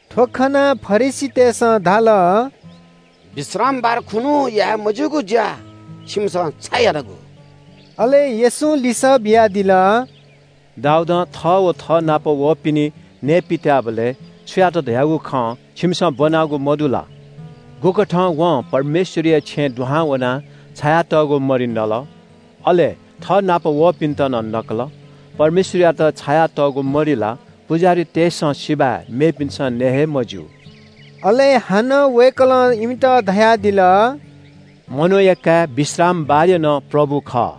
थ्‍व खनाः फरिसीतय्‌सं धाल – “विश्रामबार खुन्‍हु याये मज्‍यूगु ज्‍या छिमिसं छाय् यानागु?” अले येशूं लिसः बियादिल – “दाऊदं थः व थःनाप वःपिनि नये पित्‍याःबलय् छु यात धयागु खँ छिमिसं ब्‍वनागु मदु ला? गुकथं वं परमेश्‍वरया छेँय् दुहां वनाः छायातःगु मरि नल? अले थःनाप वःपिन्‍त नं नकल।परमेश्‍वरयात छायातःगु मरि ला पुजाहारीतय्‌सं सिबय् मेपिन्‍सं नये हे मज्‍यू।” अले हानं वय्‌कलं इमित धयादिल – “मनूया काय् विश्रामबारया नं प्रभु खः।”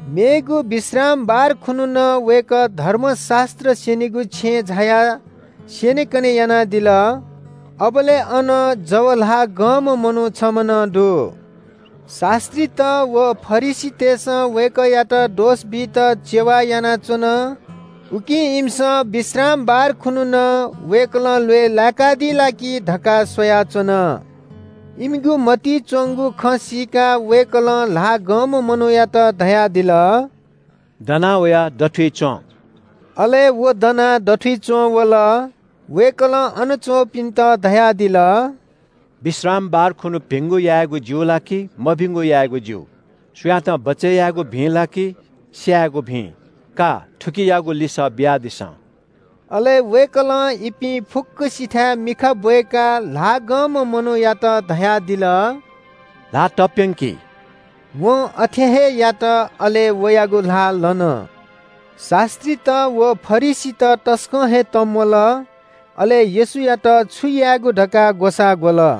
मेगु विश्रामबार खुन्‍हु नं वय्‌कः धर्मशास्‍त्र स्‍यनीगु छेँय् झायाः स्‍यनेकने यानादिल। अबलय् अन जव ल्‍हाः गंम्‍ह मनू छम्‍ह नं दु। शास्‍त्रीत व फरिसीतय्‌सं वय्‌कःयात दोष बीत चेवा यानाच्‍वन। उकिं इमिसं विश्रामबार खुन्‍हु नं वय्‌कलं ल्‍वय् लाय्‌कादी ला कि धकाः स्‍वयाच्‍वन। इमिगु मतिइ च्‍वंगु खँ सीकाः वय्‌कलं ल्‍हाः गंम्‍ह मनूयात धयादिल – “दना वयाः दथुइ च्‍वँ।” अले व दनाः दथुइ च्‍वंवल। वय्‌कलं अन च्‍वंपिन्‍त धयादिल – “विश्रामबार खुन्‍हु भिंगु यायेगु ज्‍यू ला कि मभिंगु यायेगु ज्‍यू? सुयातं बचय् यायेगु भिं ला कि स्‍यायेगु भिं? का, थुकियागु लिसः बियादिसँ।” अले वय्‌कलं इपिं फुक्‍कसिथाय् मिखा ब्‍वय्‌काः ल्‍हाः गंम्‍ह मनूयात धयादिल – “ल्‍हाः तप्‍यंकि।” वं अथे हे यात। अले वयागु ल्‍हाः लन। शास्‍त्रीत व फरिसीत तसकं हे तंम्‍वल, अले येशूयात छु यायेगु धकाः ग्‍वसाः ग्‍वल।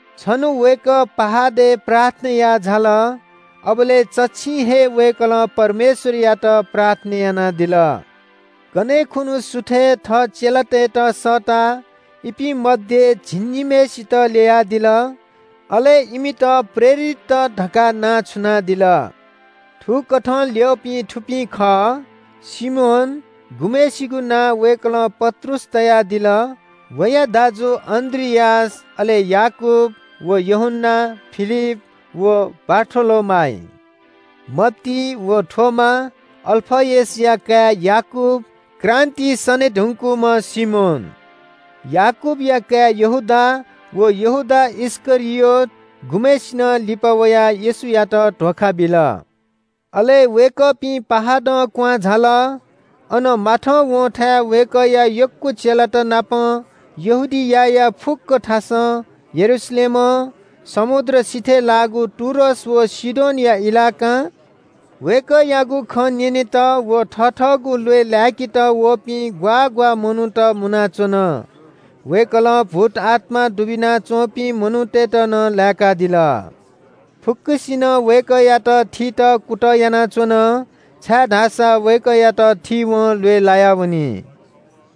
छन्‍हु वय्‌कः पहाडय् प्रार्थना याः झाल। अबलय् चच्‍छिं हे वय्‌कलं परमेश्‍वरयात प्रार्थना यानादिल। कन्‍हय् खुन्‍हु सुथय् थः चेलातय्‌त सःताः इपिं मध्‍ये झिंनिम्‍हय्‌सित ल्‍ययादिल। अले इमित प्रेरितत धकाः नां छुनादिल। थुकथं ल्‍यःपिं थुपिं खः – सिमोन, गुम्‍हय्‌सिगु नां वय्‌कलं पत्रुस तयादिल, वया दाजु अन्‍द्रियास अले याकूब व यूहन्‍ना, फिलिप व बारथोलोमाइ, मत्ती व थोमा, अल्‍फयसया काय् याकूब, क्रान्‍तिइ सने धुंकूम्‍ह सिमोन, याकूबया काय् यहूदा, व यहूदा इस्‍करियोत गुम्‍हय्‌सिनं लिपा वयाः येशूयात धोखा बिल। अले वय्‌कःपिं पहाडं क्‍वहां झाल। अन माथंवंथाय् वय्‌कःया यक्‍व चेलातनापं यहूदियाया फुक्‍क थासं, यरूशलेमं, समुद्र सिथय् लाःगु टुरोस व सीदोनया इलाकां वय्‌कःयागु खँ न्‍यनेत व थथःगु ल्‍वय् लाय्‌केत वःपिं ग्‍वाः ग्‍वाः मनूत मुनाच्‍वन। वय्‌कलं भूतआत्‍मा दुबिना च्‍वंपिं मनूतय्‌त नं लाय्‌कादिल। फुक्‍कसिनं वय्‌कःयात थीत कुतः यानाच्‍वन, छाय्‌धाःसा वय्‌कःयात थीवं ल्‍वय् लायावनी।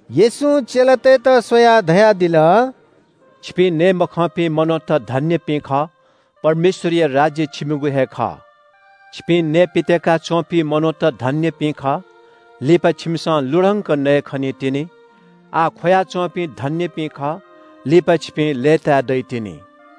येशूं चेलातय्‌त स्‍वयाः धयादिल – “छिपिं नये मखंपिं मनूत धन्‍यपिं खः। परमेश्‍वरया राज्‍य छिमिगु हे खः। छिपिं नयेपित्‍याका च्‍वंपिं धन्‍यपिं खः, छाय्‌धाःसा छिमिसं लुधंके खनीतिनि। आः ख्‍वया च्‍वंपिं धन्‍यपिं खः, छाय्‌धाःसा छिपिं लय्‌ताये दइतिनि।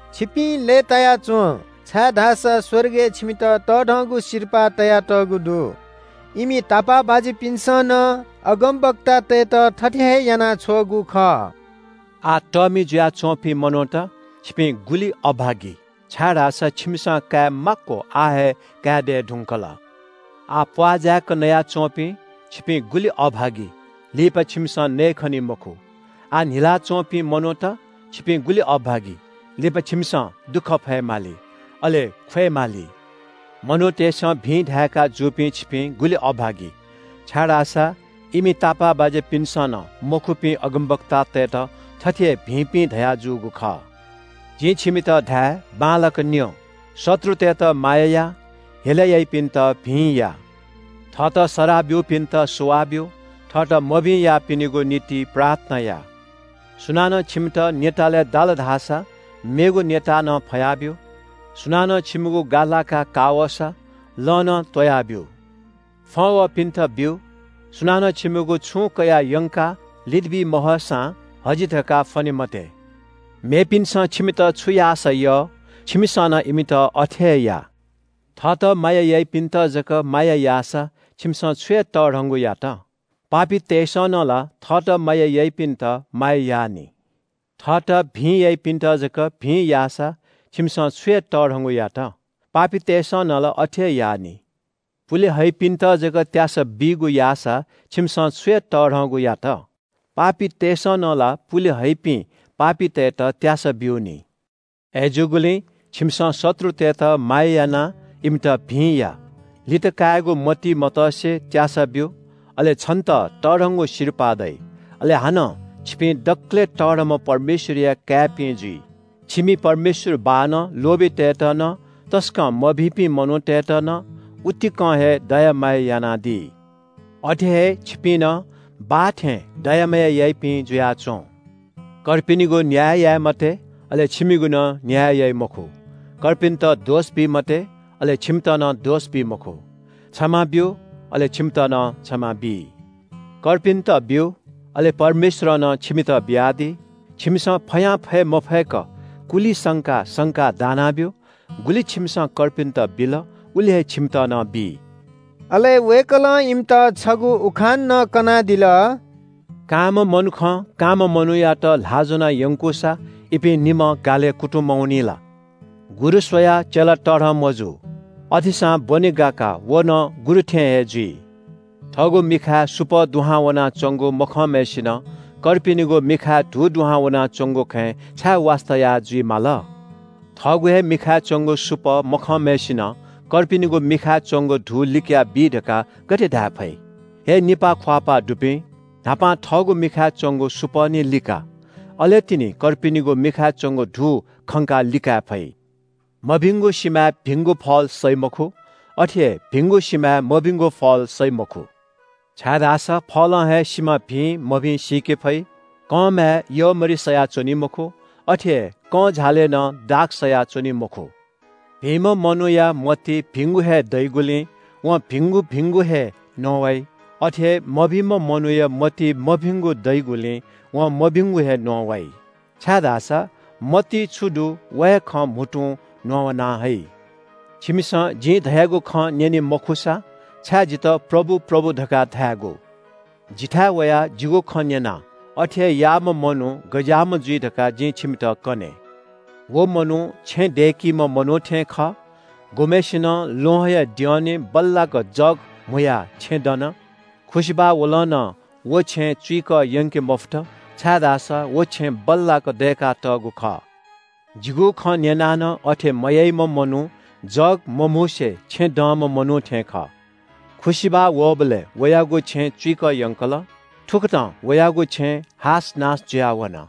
छिपिं लय्‌ताया च्‍वँ, छाय्‌धाःसा स्‍वर्गय् छिमित तःधंगु सिरपाः तयातःगु दु। इमि तापाःबाज्‍यापिन्‍सं नं अगमवक्तातय्‌त थथे हे याना छ्वःगु खः। “आः तःमि जुयाच्‍वंपिं मनूत – छिपिं गुलि अभागी, छाय्‌धाःसा छिमिसं काये माक्‍व आः हे काये दये धुंकल। आः प्‍वाः जाय्‌क नया च्‍वंपिं, छिपिं गुलि अभागी, लिपा छिमिसं नयेखनी मखु। आः न्‍हिलाः च्‍वंपिं मनूत, छिपिं गुलि अभागी, लिपा छिमिसं दुःख फयेमाली, अले ख्‍वयेमाली। मनूतय्‌सं भिं धाय्‌का जूपिं छिपिं गुलि अभागी, छाय्‌धाःसा इमि तापाःबाज्‍यापिन्‍सं नं मखुपिं अगमवक्तातय्‌त थथे हे भिंपिं धयाजूगु खः।” “जिं छिमित धाये बांलाक न्‍यँ, शत्रुतय्‌त माया या, हेला याइपिन्‍त भिं या। थःत सराः ब्‍यूपिन्‍त सुवाः ब्‍यु। थःत मभिं याःपिनिगु निंतिं प्रार्थना या। सुनानं छिमित न्‍यतालय् दाल धाःसा मेगु न्‍यता नं फया ब्‍यु। सुनानं छिमिगु गा लाका का वःसा, लं नं त्‍वया ब्‍यु। फ्‍वं वःपिन्‍त ब्‍यु। सुनानं छिमिगु छुं कयाः यंकाः लितबी महःसां हजि धकाः फ्‍वने मते। मेपिन्‍सं छिमित छु याःसा यः, छिमिसं नं इमित अथे हे या।” “थःत माया याइपिन्‍त जक माया याःसा छिमिसं छु हे तःधंगु यात? पापीतय्‌सं नं ला थःत माया याइपिन्‍त माया याः नि। थःत भिं याइपिन्‍त जक भिं याःसा छिमिसं छु हे तःधंगु यात? पापीतय्‌सं नं ला अथे याः नि। पुले हइपिन्‍त जक त्‍यासा बीगु याःसा छिमिसं छु हे तःधंगु यात? पापीतय्‌सं नं ला पुले हइपिं पापीतय्‌त त्‍यासा ब्‍यू नि। “अय्‌जूगुलिं छिमिसं शत्रुतय्‌त माया यानाः इमित भिं या। लित कायेगु मतिइ मतसे त्‍यासा ब्‍यु। अले छन्‍त तःधंगु सिरपाः दइ। अले हानं छिपिं दकलय् तःधंम्‍ह परमेश्‍वरया काय्‌पिं जुइ। छिमि परमेश्‍वर बाःनं लोभीतय्‌त नं, तसकं मभिंपिं मनूतय्‌त नं, उतिकं हे दया माया यानादी। अथे हे छिपिं नं, बाः थें, दया माया याइपिं जुयाच्‍वँ।” “कर्पिनिगु न्‍याय याये मते, अले छिमिगु नं न्‍याय याइ मखु। कर्पिन्‍त दोष बी मते, अले छिमित नं दोष बी मखु। क्षमा ब्‍यु, अले छिमित नं क्षमा बी। कर्पिन्‍त ब्‍यु, अले परमेश्‍वरं नं छिमित बियादी। छिमिसं फयां फय् मफय्‌क कुलि संकाः संकाः दानाः बी। गुलि छिमिसं कर्पिन्‍त बिल, उलि हे छिमित नं बी।” अले वय्‌कलं इमित छगू उखान नं कनादिल – “कांम्‍ह मनुखं कांम्‍ह मनूयात ल्‍हाः ज्‍वनाः यंकूसा इपिं निम्‍हं गालय् कुतुं मवनी ला? गुरु स्‍वयाः चेला तःधं मजू। अथेसां ब्‍वने गाकाः व नं गुरु थें हे जुइ। “थःगु मिखाय् सुपः दुहां वनाच्‍वंगु मखंम्‍हय्‌सिनं थः किजाया मिखाय् धू दुहां वनाच्‍वंगु खँय् छाय् वास्‍ता याः जुइ माल? थःगु हे मिखाय् च्‍वंगु सुपः मखंम्‍हय्‌सिनं थः किजाया मिखाय् च्‍वंगु धू लिकयाबी धकाः गथे धाये फइ? हे निपाः ख्‍वाःपाः दुपिं, न्‍हापां थःगु मिखाय् च्‍वंगु सुपः निं लिका। अले तिनि कर्पिनिगु मिखाय् च्‍वंगु धू खंकाः लिकाये फइ।” “मभिंगु सिमाय् भिंगु फल सइ मखु। अथे हे भिंगु सिमाय् मभिंगु फल सइ मखु, छाय्‌धाःसा फलं हे सिमा भिं मभिं सीके फइ। कंमाय् यःमरि सया च्‍वनी मखु। अथे हे कंझालय् नं दाख सया च्‍वनी मखु। भिंम्‍ह मनूया मतिइ भिंगु हे दइगुलिं वं भिंगु भिंगु हे न्‍ववाइ। अथे हे मभिंम्‍ह मनूया मतिइ मभिंगु दइगुलिं वं मभिंगु हे न्‍ववाइ, छाय्‌धाःसा मतिइ छु दु, व हे खँ म्‍हुतुं न्‍ववाना हइ।” “छिमिसं जिं धयागु खँ न्‍यने मखुसा, छाय् जितः प्रभु, प्रभु, धकाः धायेगु? जिथाय् वयाः जिगु खँ न्‍यनाः अथे हे याःम्‍ह मनू गज्‍याःम्‍ह जुइ धकाः जिं छिमित कने। व मनू छेँ दय्‌कीम्‍ह मनू थें खः। गुम्‍हय्‌सिनं ल्‍वहंया द्यःने बल्‍लाक जग म्‍हुयाः छेँ दन। खुसिबाः वलं नं व छेँ चुइकः यंके मफुत, छाय्‌धाःसा व छेँ बल्‍लाक दय्‌कातःगु खः। जिगु खँ न्‍यनाः नं अथे मयाइम्‍ह मनू जग मम्‍हुसे छेँ दंम्‍ह मनू थें खः। खुसिबाः वःबलय् वयागु छेँ चुइकः यंकल। थुकथं वयागु छेँ हासनास जुयाः वन।”